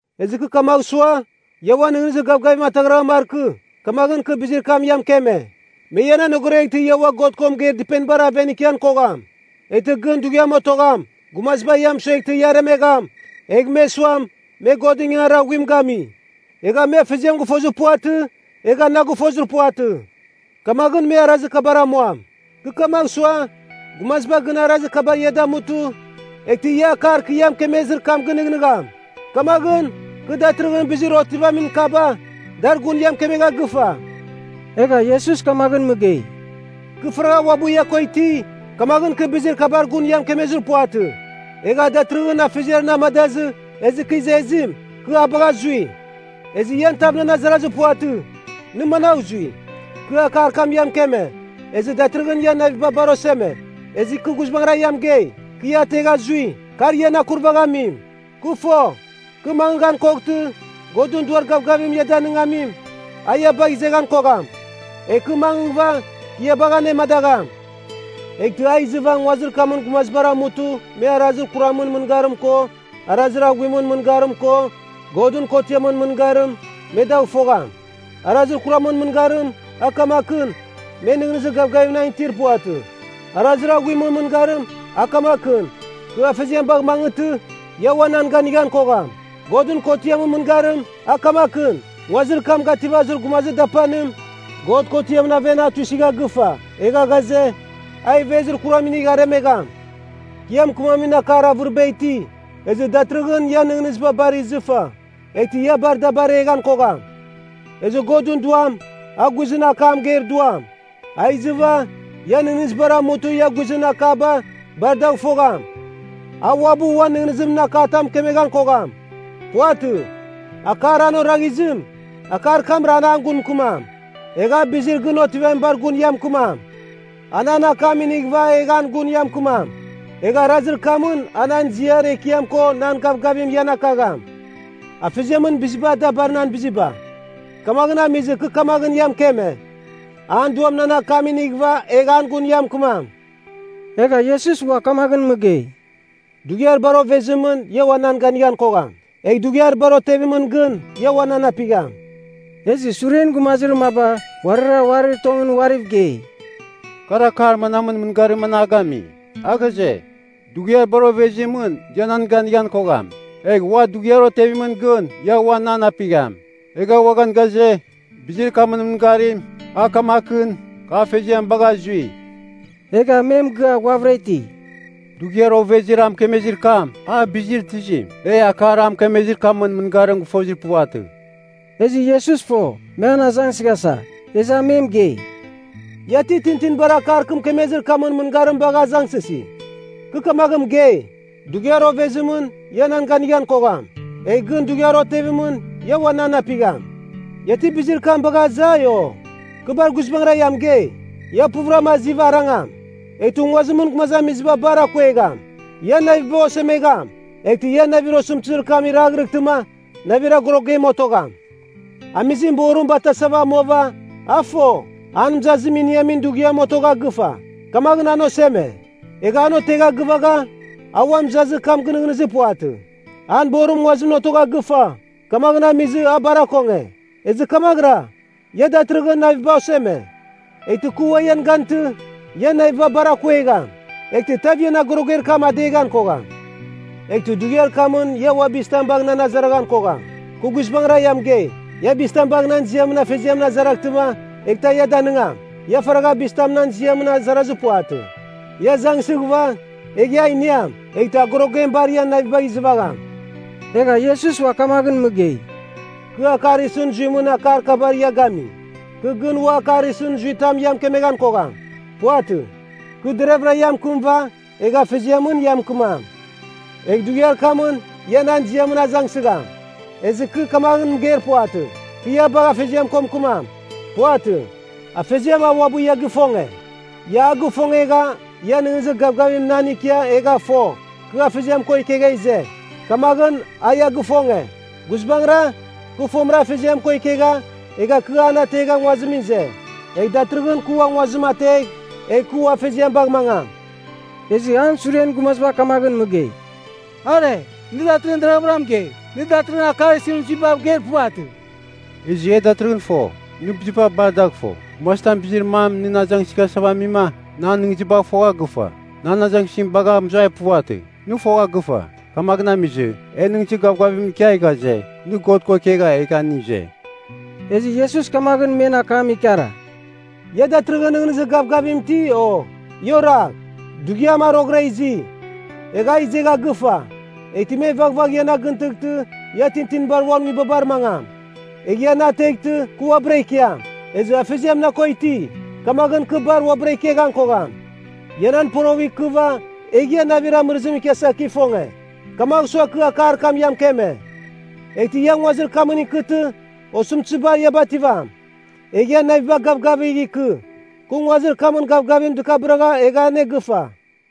“Ezɨ kɨ kamagh sua, ia uan nɨghnɨzir gavgavim ataghraghan markɨ, kamaghɨn kɨ bizir kam ia mɨkeme. Me ian anogoreghtɨ ia ua God ko mɨgeir dɨpenibar aven ikian kogham. Eghtɨ gɨn dughiam otogham, gumaziba ia mɨsueghtɨ ia aremegham, egh me suam, me Godɨn ingangarir aghuim gami. Egha me Afeziam gɨfozir puvatɨ, egha na gɨfozir puvatɨ. Kamaghɨn me arazir kabar amuam. Kɨ kamagh sua, gumaziba gɨn arazir kabar ia damutɨ, eghtɨ ia akar kɨ ia mɨkemezir kam gɨnɨghnɨgham. Kamaghɨn, kɨ datɨrɨghɨn bizir otivamin kaba, dar gun ia mɨkemegha gɨfa.” Egha Iesus kamaghɨn mɨgei, “Kɨ faragha uabɨ ia ko iti, kamaghɨn kɨ bizir kabar gun ia mɨkemezir puvatɨ. Egha datɨrɨghɨn Afeziar na amadazɨ ezɨ kɨ izezim, kɨ a bagha zui. Ezɨ ian tav nan azarazir puvatɨ, ‘Nɨ managh zui?’ Kɨ akar kam ia mɨkeme, ezɨ datɨrɨghɨn ian naviba bar oseme. Ezɨ kɨ guizbangɨra ia mɨgei, kɨ ia ategha zui, kar ian akurvaghamim. Kɨ fo, kɨ mangɨghan koghtɨ, Godɨn Duar Gavgavim ia Danɨngamim, a ia bagh izeghan kogham. Egh kɨ mangɨghɨva, kɨ ia bagh anemadagham. Eghtɨ a izɨva nguazir kamɨn gumazibar amutɨ me arazir kuramɨn mɨngarim ko arazir aghuimɨn mɨngarim ko Godɨn kotiamɨn mɨngarim, me dagh fogham Arazir kuramɨn mɨngarim, a kamakɨn, me nɨghnɨzir gavgavim na itir puvatɨ. Arazir aghuimɨn mɨngarim, a kamakɨn, kɨ Afeziam bagh mangɨghtɨ, ia ua nan ganighan kogham. Godɨn kotiamɨn mɨngarim, a kamakɨn, nguazir kam gativazir gumazir dapanim, God kotiamɨn aven a tuisɨgha gɨfa egha ghaze, a ivezir kuram inigh aremegham. “Kɨ ia mɨkɨmamin akar avɨriba iti, ezɨ datɨrɨghɨn ian nɨghnɨziba bar izɨfa, eghtɨ ia bar da bareghan kogham. Ezɨ Godɨn Duam, a guizɨn akam mɨgeir Duam, a izɨva, ian nɨghnɨzibar amutɨ ia guizɨn akaba bar dagh fogham. A uabɨ uan nɨghnɨzimɨn akatam mɨkemeghan kogham. Puvatɨ. Akar an oraghizim, akar kamra an an gun mɨkɨmam. Egh a bizir gɨn otivamibar gun ia mɨkɨmam. A nan akam inighɨva egh an gun ia mɨkɨmam. Egh arazir kamɨn a nan ziar ekiam ko nan gavgavim, ian akagham. Afeziamɨn biziba da bar nan biziba. Kamaghɨn amizɨ kɨ kamaghɨn ia mɨkeme, an Duam nan akam inighɨva egh an gun ia mɨkɨmam.” Egha Iesus ua kamaghɨn mɨgei, “Dughiar bar ovezimɨn ia ua nan ganighan kogham. Egh dughiar bar otevimɨn gɨn ia ua nan apigham.” Ezɨ suren gumazir maba uarira uarir tongɨn uariv gei, “Kar akar manamɨn mɨngarim an a gami? A ghaze, ‘Dughiar bar ovezimɨn ia nan ganighan kogham. Egh ua dughiar otevimɨn gɨn ia ua nan apigham.’ Egha uaghan ghaze, ‘Bizir kamɨn mɨngarim, a kamakɨn, kɨ Afeziam bagha zui.’” Egha me mɨgɨa ghuavɨra iti, “Dughiar ovezir a mɨkemezir kam, a bizir tizim? E akar a mɨkemezir kamɨn mɨngarim gɨfozir puvatɨ.” Ezɨ Iesus fo, me an azangsɨghasa, ezɨ a me mɨgei, “Ia ti tintinibar akar kɨ mɨkemezir kamɨn mɨngarim bagha azangsɨsi? Kɨ kamaghɨn mɨgei, ‘Dughiar ovezimɨn ia nan ganighan kogham. Egh gɨn dughiar otevimɨn ia uan nan apigham.’ Ia ti bizir kam bagha azai, o? Kɨ bar guizbangɨra ia mɨgei, ia puvɨram aziva arangam. Eghtɨ nguazimɨn gumazamiziba bar akuegham. Ian naviba osemegham. Eghtɨ ian navir osɨmtɨzir kam iraghrɨghtɨma navir agorogem otogham. Amizim borim batasava amuava, a fo, an mɨzazim iniamin dughiam otogha gɨfa. Kamaghɨn an oseme. Egha an otegha gɨvagha, a ua mɨzazir kam gɨnɨghnɨzir puvatɨ. An borim nguazimɨn otogha gɨfa, kamaghɨn amizɨ a bar akonge. Ezɨ kamaghɨra, ia datɨrɨghɨn naviba oseme. Eghtɨ kɨ ua ian gantɨ, ian naviba bar akuegham. Eghtɨ tav ian agoroger kam adeghan kogham. Eghtɨ dughiar kamɨn ia ua bizitam bagh nan azaraghan kogham. Kɨ guizbangɨra ia mɨgei, ia bizitam bagh nan ziamɨn Afeziamɨn azaraghtɨma eghtɨ a ia danɨngam. Ia faragha bizitam nan ziamɨn azarazir puvatɨ. Ia azangsɨghɨva, egh ia iniam, eghtɨ agorogem bar ian navibagh izɨvagham.” Egha Iesus ua kamaghɨn mɨgei, “Kɨ akar isɨn zuimɨn akar kabar ia gami. Kɨ gɨn ua akar isɨn zuitam ia mɨkemeghan kogham. Puvatɨ. Kɨ deravɨra ia mɨkɨmɨva, egh Afeziamɨn ia mɨkɨmam. Egh dughiar kamɨn ia nan ziamɨn azangsɨgham. Ezɨ kɨ kamaghɨn mɨgeir puvatɨ, kɨ ia bagh Afeziamɨn ko mɨkɨmam. Puvatɨ. Afeziam a uabɨ ia gifonge. Ia a gifongegha ia nɨghnɨzir gavgavim nan ikia egha fo, kɨ Afeziam ko ikegha ize. Kamaghɨn a ia gifonge. Guizbangɨra, kɨ fomɨra Afeziam ko ikegha, egha kɨ an ategha nguazimɨn ize. Egh datɨrɨghɨn kɨ ua nguazim ategh, egh kɨ ua Afeziam bagh mangam.” Ezɨ an suren gumaziba kamaghɨn mɨgei, “Are, nɨ datɨrɨghɨn deravɨra mɨgei, nɨ datɨrɨghɨn akar isɨn zuibav geir puvatɨ. Ezɨ e datɨrɨghɨn fo, nɨ biziba bar dagh fo. Gumazitam bizir mam nɨn azangsɨghasava amima, nɨ an nɨghnɨzibagh fogha gɨfa. Nɨ an azangsɨzim bagha mɨzuai puvatɨ, nɨ fogha gɨfa. Kamaghɨn amizɨ, e nɨghnɨzir gavgavim ikia ghaze, nɨ God ko ikegha egha nɨ ize.” Ezɨ Iesus kamaghɨn men akam ikara, “Ia datɨrɨghɨn nɨghnɨzir gavgavim iti, o? Ia oragh. Dughiam a roghɨra izi, egha a izegha gɨfa, eghtɨ me vaghvagh ian agɨntɨghtɨ ia tintinibar uan nguibabar mangam. Egh ia na ateghtɨ kɨ uabɨra ikiam. Ezɨ Afeziam na ko iti, kamaghɨn kɨ bar uabɨra ikeghan kogham. Ia nan poroghɨv ikɨva egh ia navir amɨrɨzim ikiasa kɨ ifonge. Kamagh sua kɨ akar kam ia mɨkeme. Eghtɨ ia nguazir kamɨn ikɨtɨ, osɨmtɨziba ia bativam. Egh ian naviba gavgavigh ikɨ! Kɨ nguazir kamɨn gavgavim dɨkabɨragha egha anegɨfa!”